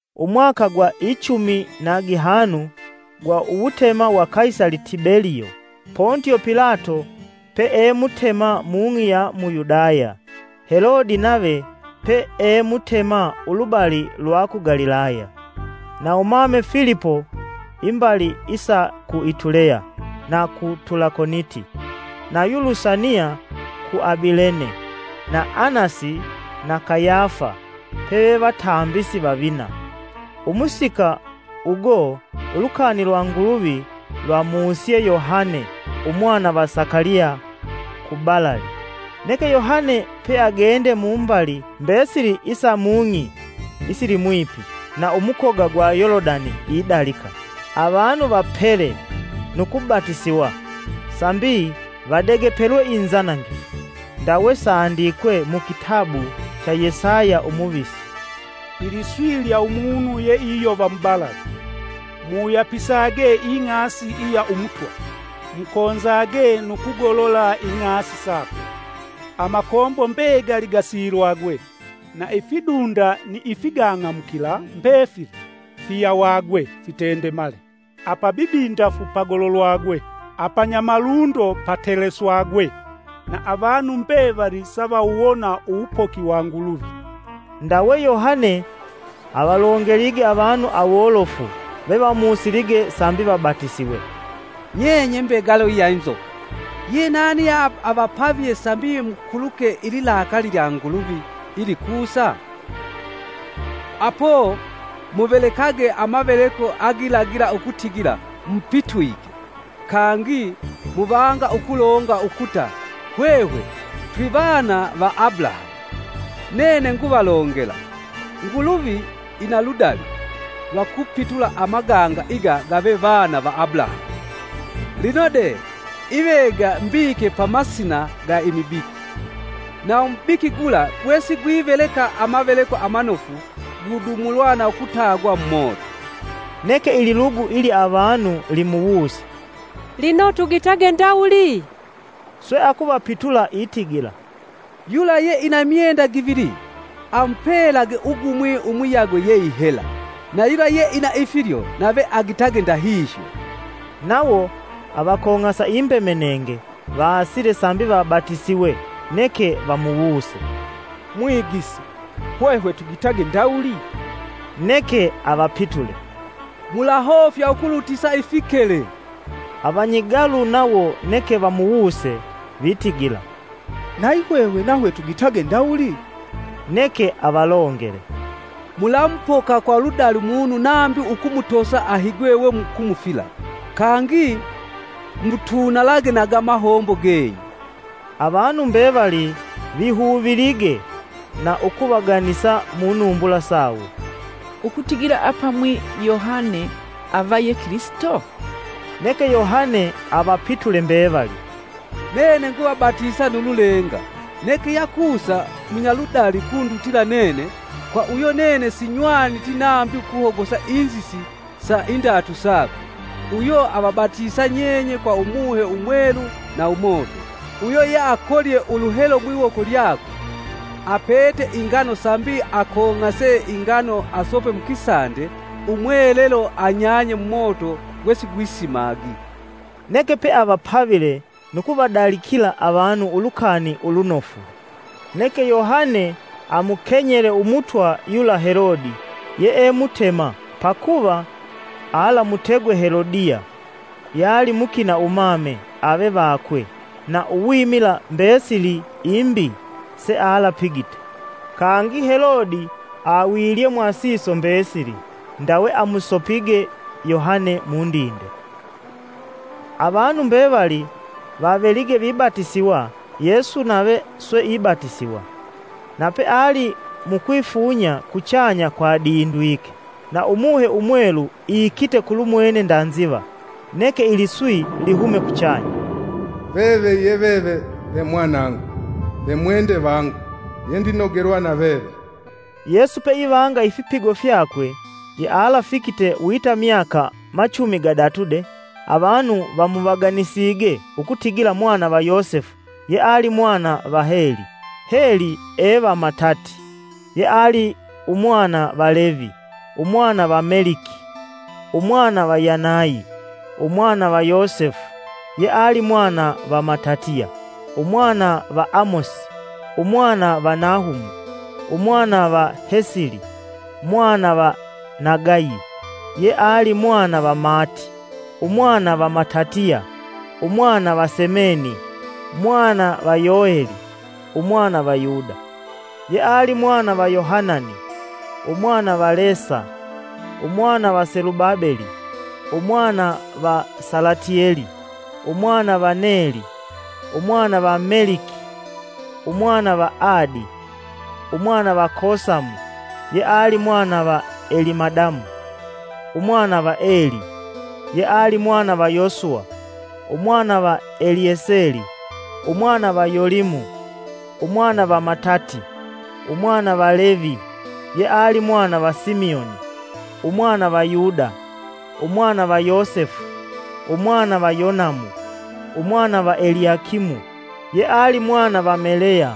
Umwaka gwa ichumi na gihanu gwa uwutema wa Kaisali Tibeliyo. Pontio Pilato pee Mutema mung'i ya mu Yudaya, Helodi nave pee mutema ulubali lwa ku Galilaya, na umame Filipo imbali isa ku Ituleya na ku Tulakoniti; nayu Lusania ku Abilene, na Anasi na Kayafa peve vatambisi vavina; umusika ugo ulukani lwa Nguluvi lwamusye Yohane umwana va Sakaliya kubalali. Neke Yohane peagende mumbali mbesili isa mung'i isilimwipi na umukoga gwa Yolodani idalika, “Avanu vapele nu kubatisiwa sambi vadegepelwe inzanangifu.” Ndawe sandikwe mu kitabu cha Yesaya umuvisi: “Iliswi lya umunu ye iyova mubalali ‘Muwuyapisage ing'asi iya Umutwa. Mukonzage nu kugolola ing'asi sakwe, Amakombo mbegali gasilwage, na ifidunda ni ifigang'amukila mbefili, fiyawage fitendemale, apabibindafu pagololwagwe, apanyamalundo pateleswagwe. Na avanu mbevali savawuwona uwupoki wa Nguluvi.’” Ndawe Yohane avalongelige avanu awolofu ve vamusilige sambi vabatisiwe: “Nye nye mbegalo ya inzoka! Ye nani ye avapavye sambi mukuluke ililakali lya Nguluvi ilikusa? Apo muvelekage amaveleko agilagila ukutigila mupitwike. Kangi muvanga ukulonga ukuta, ‘Hwehwe twivana va Abulahamu’ Nene nguvalongela Nguluvi ina ludali lwa kupitula amaganga iga gave vana va Abulahamu. Lino de ivega mbike pa masina ga imibiki, na umubiki gula gwesigwiveleka amaveleko amanofu gudumulwa na ukutagwa mumoto.” Neke ililugu ilya avanu limuwuse, “Lino tugitage ndawuli?” Swe akuvapitula itigila, “Yula ye ina imyenda givili, amupelage ugumwi umuyagwe ye ihela, na yula yeina ifilyo nave agitage ndahihyo.” Nawo avakong'asa imbemenenge, vaasile sambi vabatisiwe neke vamuwuse, “Mwigisi, hwehwe tugitage ndawuli?” Neke avapitule, “Mulahofya ukulutisa ifikele.” Avanyigalu nawo neke vamuwuse vitigila, “Nayi hwehwe nahwe tugitage ndawuli?” Neke avalongele, “Mulamupoka kwa ludali munu nambi ukumutosa ahigwe we mukumufila, kangi mutunalage na ga mahombo genyu.” Avanu mbevali vihuvilige na ukuvaganisa mu numbula sawo, ukutigila apamwi Yohane ava ye Kilisito. Neke Yohane avapitule mbevali, “Nene nguvabatisa nu lulenga, neke yakusa munyaludali ukundutila nene, kwa uyo nene sinywaniti nambi ukuhogosa inzisi sa indatu sakwe. Uyo avabatisa nyenye kwa Umuhe Umwelu na umoto. Uyo ye akolye uluhelo mwiwoko lyakwe, apete ingano sambi akong'ase ingano asope mukisande, umwelelo anyanye mumoto gwe sigwisimagi.” Neke peavapavile nu kuvadalikila avanu Ulukani Ulunofu. Neke Yohane amukenyele umutwa yula Helode yee mutema pakuva alamutegwe Helodiya yali mukina umame ave vakwe na uwimila mbesili imbi sealapigite. Kangi Helode awilye mwasiso mbesili ndawe amusopige Yohane mundinde. Avanu mbevali vavelige vibatisiwa Yesu nave swe ibatisiwa. Na peali mukwifunya kuchanya kwadindwike, na Umuhe Umwelu iikite kulumwene nda nziva, neke iliswi lihume kuchanya, “Veve ye veve ve mwanangu, ve mwende vangu yendinogelwa na veve.” Yesu peivanga ifipigo fyakwe, yealafikite wita myaka machumi gadatu de, avanu vamuvaganisige ukutigila mwana va Yosefu, yeali mwana va Heli, Heli e va Matati, yeali umwana va Levi, umwana va Meliki, umwana va Yanayi, umwana va Yosefu, yeali mwana va Matatiya, umwana va Amosi, umwana va Nahumu, umwana va Hesili, mwana va Nagayi, yeali mwana va Maati, umwana va Matatiya, umwana va Semeni, mwana va Yoheli, umwana va Yuda, yeali mwana va Yohanani, umwana va Lesa, umwana va Selubabeli, umwana va Salatieli, umwana va Neli, umwana va Meliki, umwana va Adi, umwana va Kosamu, yeali mwana va Elimadamu, umwana va Eli, yeali mwana va Yosuwa, umwana va Elieseli, umwana va Yolimu, umwana va Matati, umwana va Levi, yeali mwana va Simioni, umwana va Yuda umwana va Yosefu, umwana va Yonamu, umwana va Eliakimu, yeali mwana va Maleya,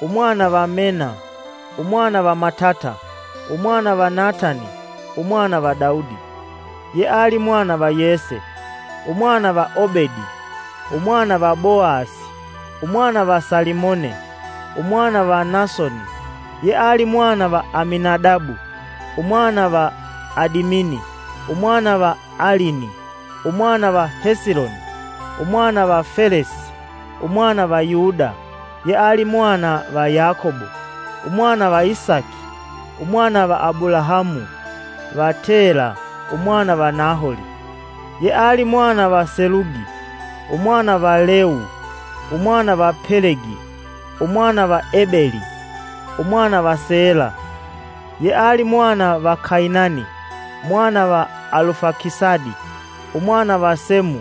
umwana va Mena, umwana va Matata, umwana va Natani, umwana va Daudi, yeali mwana va Yese, umwana va Obedi, umwana va Boasi, umwana va Salimone, umwana va Nasoni, yeali mwana va Aminadabu, umwana va Adimini, umwana va Alini, umwana va Hesiloni, umwana va Felesi, umwana va Yuda, yeali mwana va Yakobo, umwana va Isaki, umwana va Abulahamu, va Tela, umwana va Naholi, yeali mwana va Selugi, umwana va Leu, umwana va Pelegi, umwana va Ebeli, umwana va Sala, yeali mwana va Kainani, umwana va Alufakisadi, umwana va Semu,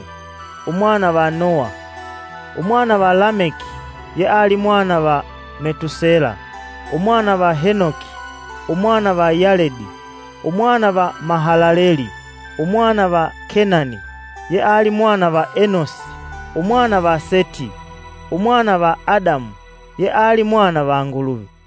umwana va Noha, umwana va Lameki, yeali mwana va Metusela, umwana va Henoki, umwana va Yaledi, umwana va Mahalaleli, umwana va Kenani, yeali mwana va Enosi, umwana va Seti, umwana va Adamu yeali mwana va Nguluvi.